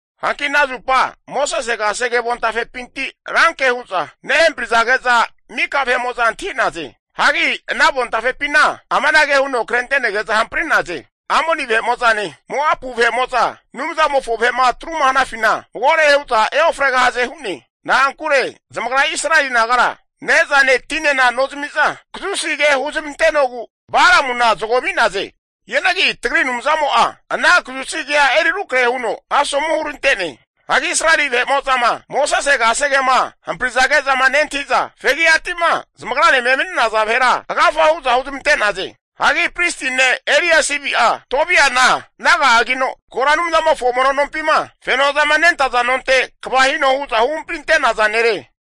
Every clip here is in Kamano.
Hanki ana zupa Mosese kasege avontafepinti ranke hu'za nehamparizage'za mika vahe'mo'za antahi'naze. Hagi ana avontafepina amanage huno krente'nege'za hampri'naze, Amoni vahe'mo'zane Moapu vahe'mo'za Anumzamofo vahe'ma atruma hanafina magore hu'za eofregahaze hu'ne. Na'ankure zamagra Israeli nagara ne'zane tinena nozami'za, kazusi ke huzmantenogu Balamuna zago ami'naze. Hianagi tagri Anumzamo'a ana kazusi kea eri rukrahe huno asomu hurante'ne. Hagi Israeli vahe'ma Mosese kasegema hamprizage'zama nentahi'za, fegi'ati'ma zamagranema emani'naza vahera agafa hu'za huzmante'naze. Hagi pristi ne' Eliasibi'a Tobiana naga'agino, kora Anumzamofo mono nompima fenozama nentaza nonte kva hino hu'za huhamparinte'naza nere.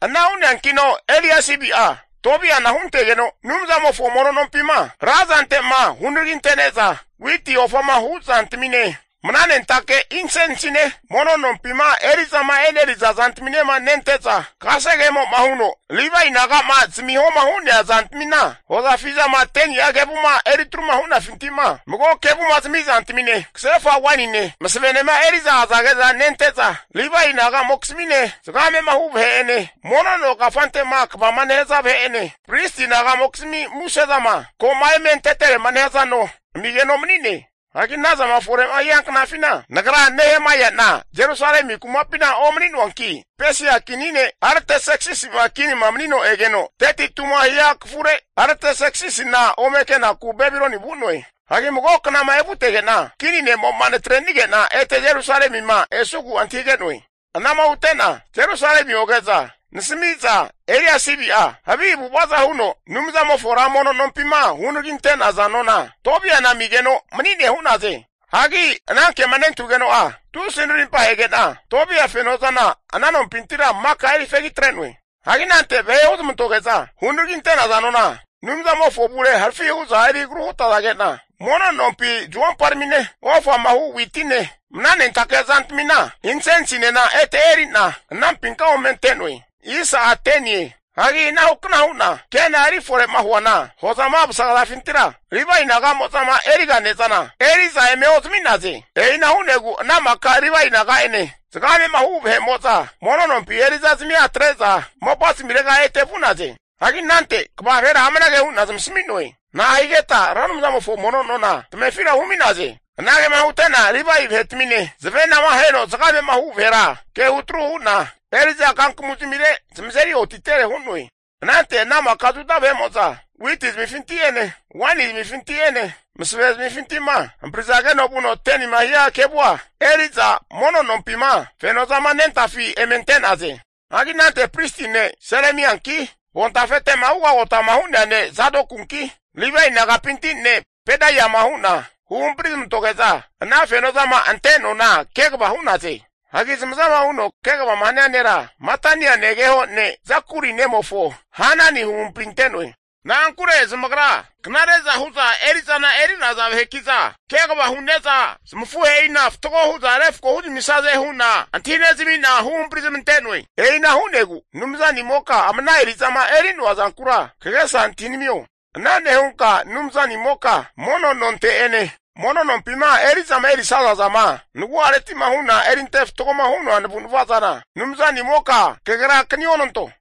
Ana hu'neankino Eliasibi'a Tobiana huntegeno, Anumzamofo mono nompima ra zantema hunaragintene'za, witi ofama hu zantamine, mnanentake insensine mono nompima eri'zama eneriza zantaminema nente'za, kasegemo'ma huno Livae naga'ma zamihoma hu'nea zantamina, hozafi zama 10ni'a kevuma eritruma hu'nafintima mago kevuma zamiza zantamine, kasefa wainine, masavenema eri'za azage'za nente'za Livae nagamokizmine, zagamema hu vahe'ene, mono no kafante'ma kvama nehaza vahe'ene, pristi naga'mokizmi musezama ko'ma eme anteterema nehaza nona amigeno mani'ne. Hagi ana zama fore'ma hia knafina nagra Nehemaia'na Jerusalemi kumapina omani'noanki, Pesia kini ne' Artaserksisi'ma kinima manino egeno 32ma hiankafure Artaserksisina ome kenaku Babiloni vu'noe. Hagi mago knama evutege'na, Kini ne'mo'ma natre'nige'na ete Jerusalemima esugu antahige'noe. Anama hute'na Jerusalemi oge'za nasamiza Eliasibi'a havi avu'avaza huno, Anumzamofo ra mono nompima hunaraginte'naza nona Tobia'na amigeno mani'ne hu'naze. Hagi ana kema nentahugeno'a, tusi narimpahege'na, Tobia fenozana ana nompintira maka eri fegi atre'noe. Hagi anante vahe huzamantoge'za hunaraginte'naza nona Anumzamofo avure harafi hu'za eri agru hutazage'na, mono nompi zuomparamine ofama hu witine, mnanentake zantamina insensinena ete eri'na anampinka ome ante'noe. Hagi anahukna hu'na ke'na eri fore'ma huana, hozama vasagazafintira, Livae naga'mozama eri'ga ne'zana, eriza eme ozami'naze. E'ina hu'negu ana maka Livae naga'ene zagame'ma hu vahe'mo'za mono nompi eri'zazamia atre'za mopa zamirega ete vu'naze. Hagi anante kva vahera amanage hu'na zamasami'noe. Na'ahigeta Ra Anumzamofo mono nona tamefira humi'naze. Anagema hute'na Livae vahetamine zavenama aheno zagamema hu vahera ke hutru hu'na, eri'za kankamu zamire zamazeri otitere hu'noe. Anante ana maka Juda witi zamifinti'ene, waini zamifinti'ene, masave zamifinti'ma, hamprizageno vuno 10nima hia kevua eri'za mono nompima fenozama nentafi eme ante'naze. Hagi anante pristi ne' Selemianki avontafete'ma ugagota'ma hu'nea ne' Zadokunki Livae nagapinti ne' Pedaiama hu'na huhampari zamantoge'za, ana fenozama ante nona kegava hu'naze. Hagi zamazama huno kegavama hania nera, Matania negeho ne' Zakuri nemofo Hanani huhampri ante'noe. Na'ankure zamagra knare'za hu'za eri'zana eri'naza vaheki'za, kegava hu'neza zamafuhe'ina fatgo hu'za refko huzamisaze hu'na antahinezami'na huhampari zamante'noe. E'ina hu'negu Anumzanimoka ama ana eri'zama eri'noa zankura kagesa antahinamio. Ana nehunka Anumzanimoka mono nonte'ene, mono nompima eri'zama erisaza zama nagu'areti'ma hu'na erinte fatgoma hu'noa navu'navazana Anumzanimoka kagerakani onanto.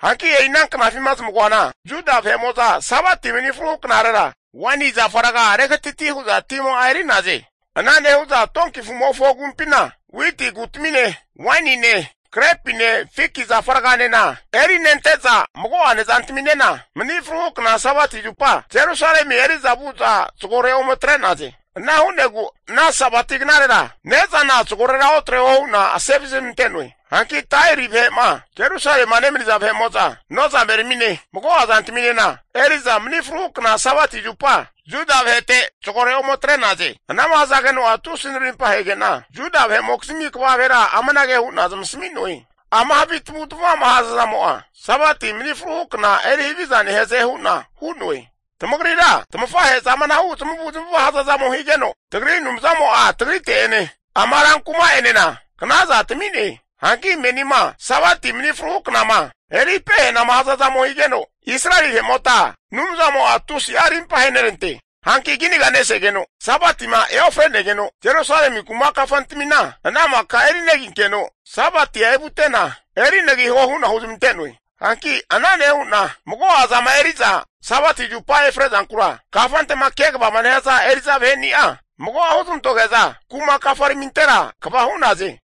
Hanki e'ina knafima zamagoana Juda vahe'mo'za Sabati mani fruhu knarera, waini zafa raga regatati hu'za tima'a eri'naze. Ana nehu'za donki afu'mofo agumpina witi kutamine wainine, grepine, fiki zafa raganena erinente'za mago'a nezantaminena, mani fru kna Sabati zupa Jerusalemi vu'za zagore ome atre'naze. Ana hu'negu ana Sabati knarera ne'zana zagorera otreho hu'na asevazi zamante'noe. Hanki Tairi vahe'ma Jerusalema nemaniza, nozameramine mago'a zantaminena, eri'za mani fruhu kna Sabati zupa Juda vahete zagore ome atre'naze. Anama hazageno'a tusi narimpa hege'na, Juda vahe'mokizmi kva vahera amanage hu'na zamasami'noe, ama havi tamavu tamava'ma hazazamo'a Sabati mani fruhu kna erihaviza nehaze hu'na hu'noe. Tamagrira tafahe'za amanahu zamavu zamava hazazamo higeno, tagri Anumzamo'a tagrite'ene ama rankuma'enena knazana tami'ne. Hanki menima Sabati mani fruhu knama eri pehanama hazazamo higeno Israeli vahe'mota Anumzamo'a tusi'a rimpa ahenerante. Hanki kinaga nesegeno Sabatima eofre'negeno, Jerusalemi kuma kafantamina ana maka eriginenkeno Sabatia evute'na erinagiho hu'na huzamante'noe. Hanki ana nehu'na, mago'a zama eri'za Sabati zupama efre zankura kafante'ma kegavama nehaza eri'za vaheni'a mago'a huzamantoge'za kuma kafaramintera kva hu'naze.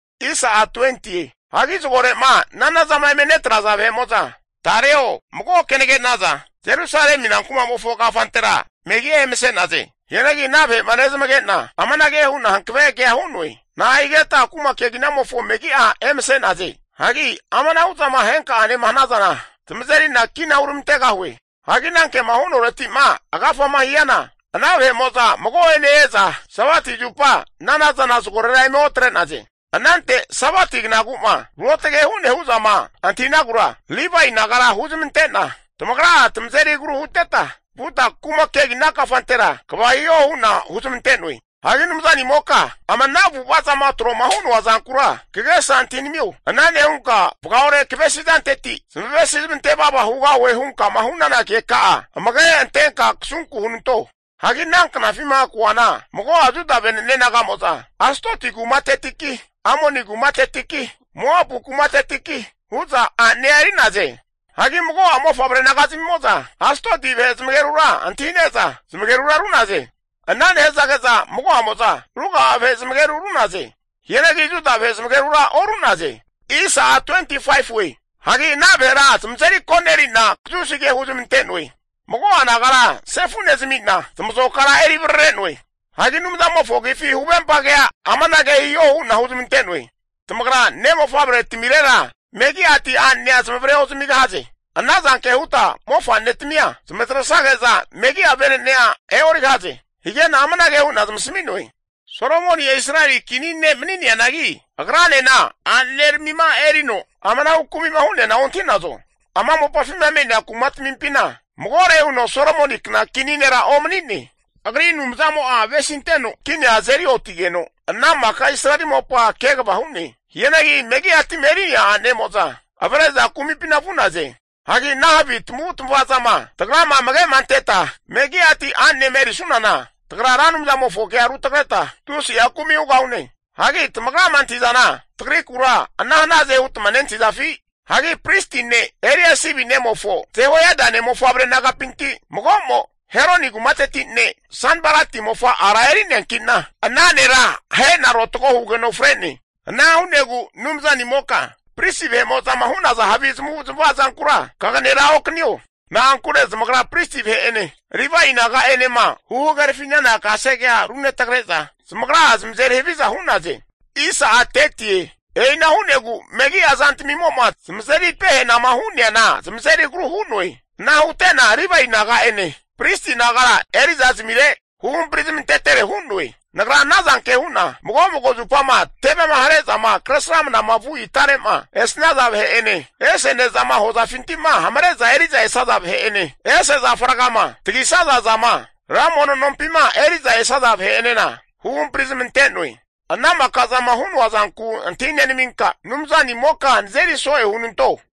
Hagi zagore'ma nanazama eme netraza vahe'mo'za tareo mago kenage naza Jerusalemi rankumamofo kafantera megi'a emase'naze. Hianagi ana vahe'ma nezamage'na amanage hu'na hankave kea hu'noe, na'ahigetma kuma keginamofo megi'a emase'naze. Hagi amanahu zama henka'anema hanazana, tamazeri'na kina huramantegahue. Hagi anankema hu'noreti'ma agafama hiana ana vahe'mo'za mago'ene e'za Sabati zupa nanazana zagorera eme otre'naze. Anante Sabati knagu'ma ruotage hu'ne hu'zama antahinagura, Livae nagara huzamante'na tamagra'a tamazeri agru huteta vuta kuma kegina kafantera kva hiho hu'na huzamante'noe. Hagi Anumzanimoka ama ana avu'ava zama tro'ma hu'noa zankura kagesa antahinamio, ana nehunka vagaore kavesi zanteti, zamavesi zamante vava hugahue hunkama hu'nana keka'a amage antenka kasunku hunanto. Hagi ana knafima koana, mago'a Juda vene'ne naga'mo'za Astoti kumatetiki, Amoni kumatetiki, Moapu kumatetiki hu'za a'nea eri'naze. Hagi mago'a mofavre nagazamimo'za, Astoti vahe zamagerura antahi'neza zamagerura ru'naze. Ana nehazage'za mago'amo'za ruga'a vahe zamageru ru'naze. Hianagi Juda vahe zamagerura oru'naze. Hagi ana vahera zamazeri koneri'na kazusi ke huzamante'noe. Mago'a nagara sefu nezami'na zamazokara eri varare'noe. Hagi Anumzamofo agifi huvempa kea amanage hiho hu'na huzmante'noe. Tamagra ne' mofavretamirera megi'ati a'nenea zamavare ozamigahaze. Ana zanke huta mofa'netamia zamatresage'za megi'a vene'nea e'origahaze. Hige'na amanage hu'na zamasami'noe, Solomoni'a Israeli kini ne' mani'neanagi agranena a'neneramima erino amanahu kumi'ma hu'neana ontahi'nazo? Ama mopafima me'nea kumatmimpina magore huno Solomonikna kini nera omani'ne. Agri Anumzamo'a avesinteno kinia azeri otigeno, ana maka Israeli mopa kegava hu'ne. Hianagi megi'ati'ma eri'nea a'nemo'za avre'za kumipina vu'naze. Hagi ana havi tamavu tamava zama tagrama amage'ma anteta, megi'ati a'nenema erisunana, tagra Ra Anumzamofonkea rutagreta, tusi'a kumi hugahune. Hagi tamagrama antahi'zana tagrikura ana hanaze hutma nentahizafi? Hagi pristi ne' Eliasibi nemofo Jehoiada ne'mofavre nagapinti mago'mo, Heroni kumateti ne' Sanbalati mofa ara erineanki'na, ana nera ahe'na rotago hugeno fre'ne. Ana hu'negu Anumzanimoka pristi vahe'mo'zama hu'naza havi zamavu zamava zankura kaganera okanino. Na'ankure zamagra pristi vahe'ene Livae naga'enema huhagerafi'nana kasegea runetagre'za zamagra'a zamazeri haviza hu'naze. E'ina hu'negu megi'a zantamimo'ma zamazeri pehanama hu'neana zamazeri agru hu'noe. Ana hute'na Livae naga'ene pristi nagara eri'za zamire huhampari zamantetere hu'noe. Nagra anazanke hu'na, mago mago zupama tevema hare'zama kresramnama vu itare'ma esnaza vahe'ene, ese ne'zama hozafinti'ma hamare'za eri'za esaza vahe'ene, ese zafa rgama tagisaza zama Ra Mono nompima eriza esaza vahe'enena huhampari zamante'noe. Ana maka zama hu'noa zanku antahi nenaminka Anumzanimoka nazeri so'e hunanto.